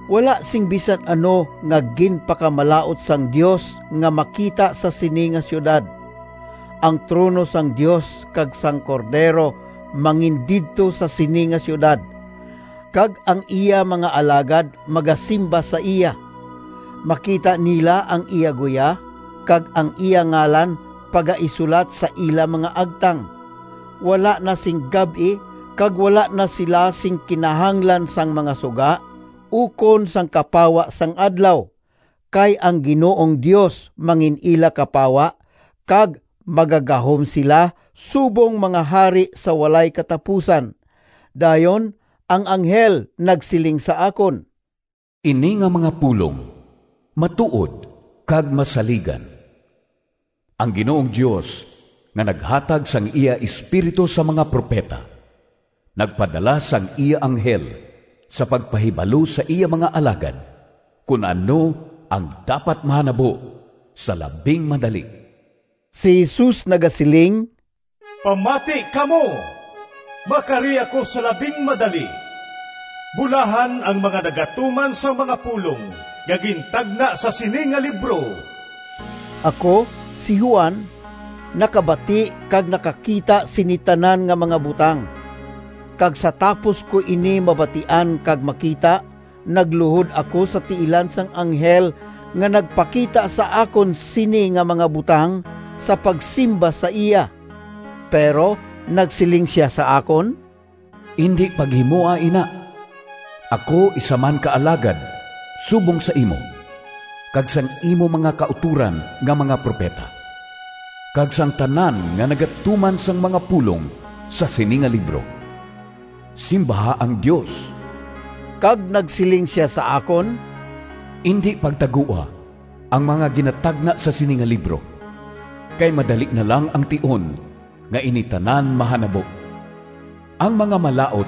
Wala sing bisan ano nga ginpakamalaut sang Dios nga makita sa sini nga siyudad. Ang trono sang Dios kag sang Cordero mangindidto sa sini nga siyudad, kag ang iya mga alagad magasimba sa iya. Makita nila ang iya guya, kag ang iya ngalan pagaisulat sa ila mga agtang. Wala na sing gab-i, kag wala na sila sing kinahanglan sang mga suga ukon sang kapawa sang adlaw, kay ang Ginoong Dios mangin-ila kapawa, kag magagahom sila subong mga hari sa walay katapusan. Dayon ang anghel nagsiling sa akon, “Ini nga mga pulong matuod kag masaligan. Ang Ginoong Dios, nga naghatag sang iya Espiritu sa mga propeta, nagpadala sang iya anghel sa pagpahibalo sa iya mga alagad, kon ano ang dapat mahanabo sa labing madali.” Si Jesus nagasiling, “Pamati kamo! Makari ako sa labing madali! Bulahan ang mga nagatuman sang mga pulong nga gintagna sa sini nga libro!” Ako, si Juan, nakabati kag nakakita sini tanan nga mga butang. Kag sa tapos ko ini mabatian kag makita, nagluhod ako sa tiilan sang anghel nga nagpakita sa akon sini nga mga butang, sa pagsimba sa iya. Pero nagsiling sia sa akon, “Indi paghimoa ina! Ako isa man ka alagad subong sa imo, kag sang imo mga kautoran nga mga propeta, kag sang tanan nga nagatuman sang mga pulong sa sini nga libro. Simbaha ang Dios!” Kag nagsiling sia sa akon, “Indi pagtagoa ang mga ginatagna sa sini nga libro, kay madali na lang ang tion nga ini tanan mahanabo. Ang mga malaut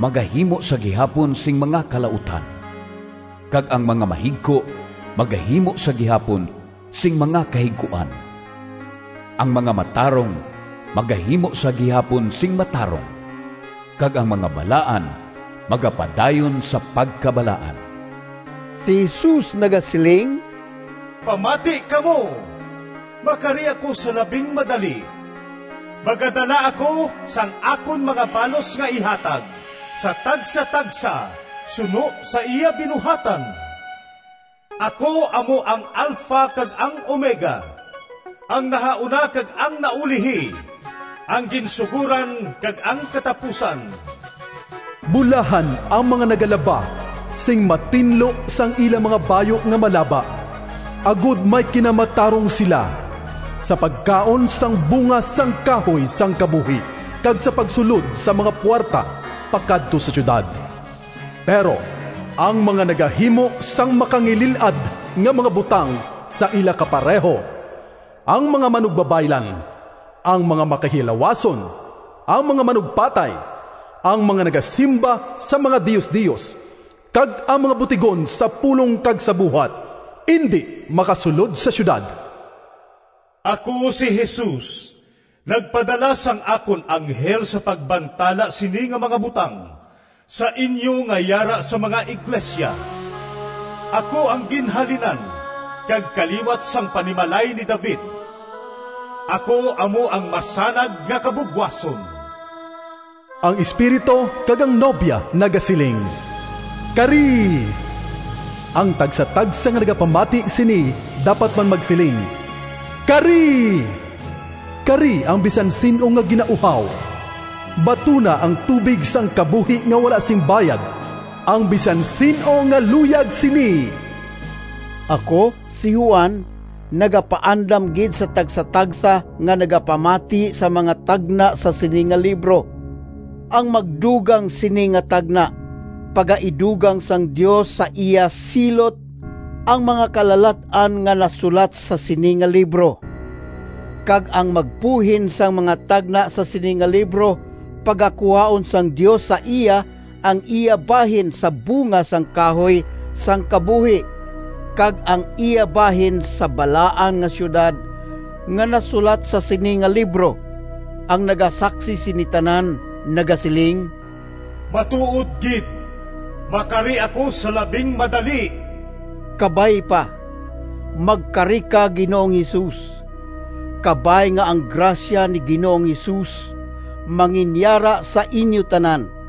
magahimo sa gihapon sing mga kalautan, kag ang mga mahigko magahimo sa gihapon sing mga kahigkuan. Ang mga matarong magahimo sa gihapon sing matarong, kag ang mga balaan magapadayon sa pagkabalaan.” Si Jesus nagasiling, “Pamati kamo! Makari ako sa labing madali! Magadala ako sang akon mga balos nga ihatag sa tagsatagsa suno sa iya binuhatan. Ako amo ang Alpha kag ang Omega, ang nahauna kag ang naulihi, ang ginsugoran kag ang katapusan.” Bulahan ang mga nagalaba sing matinlo sang ila mga bayu nga malaba, agod may kinamatarong sila sa pagkaon sang bunga sang kahoy sang kabuhi, kag sa pagsulod sa mga puwerta pakadto sa siyudad. Pero ang mga nagahimo sang makangilil-ad nga mga butang sa ila kapareho, ang mga manugbabaylan, ang mga makihilawason, ang mga manugpatay, ang mga nagasimba sa mga diosdios, kag ang mga butigon sa pulong kag sa buhat indi makasulod sa siyudad. “Ako, si Jesus, nagpadala sang akon anghel sa pagbantala sini nga mga butang sa inyo nga yara sa mga iglesia. Ako ang ginhalinan kag kaliwat sang panimalay ni David; ako amo ang masanag nga kabugwason.” Ang Espiritu kag ang Nobya nagasiling, “Kari!” Ang tagsatagsa nga nagapamati sini dapat man magsiling, “Kari!” Kari, ang bisan sin-o nga ginauhaw. Batuna ang tubig sang kabuhi nga wala sing bayad, ang bisan sin-o nga luyag sini. Ako, si Juan, nagapaandam gid sa tagsatagsa nga nagapamati sa mga tagna sa sini nga libro. Ang magdugang sini nga tagna, pagaidugang sang Dios sa iya silot ang mga kalalat-an nga nasulat sa sini nga libro. Kag ang magbuhin sang mga tagna sa sini nga libro, pagakuhaon sang Dios sa iya ang iya bahin sa bunga sang kahoy sang kabuhi, kag ang iya bahin sa Balaan nga Siyudad, nga nasulat sa sini nga libro. Ang nagasaksi sini tanan, nagasiling, “Matuod gid! Makari ako sa labing madali!” Kabay pa. Magkari ka, Ginoong Jesus! Kabay nga ang grasya ni Ginoong Jesus manginyara sa inyo tanan.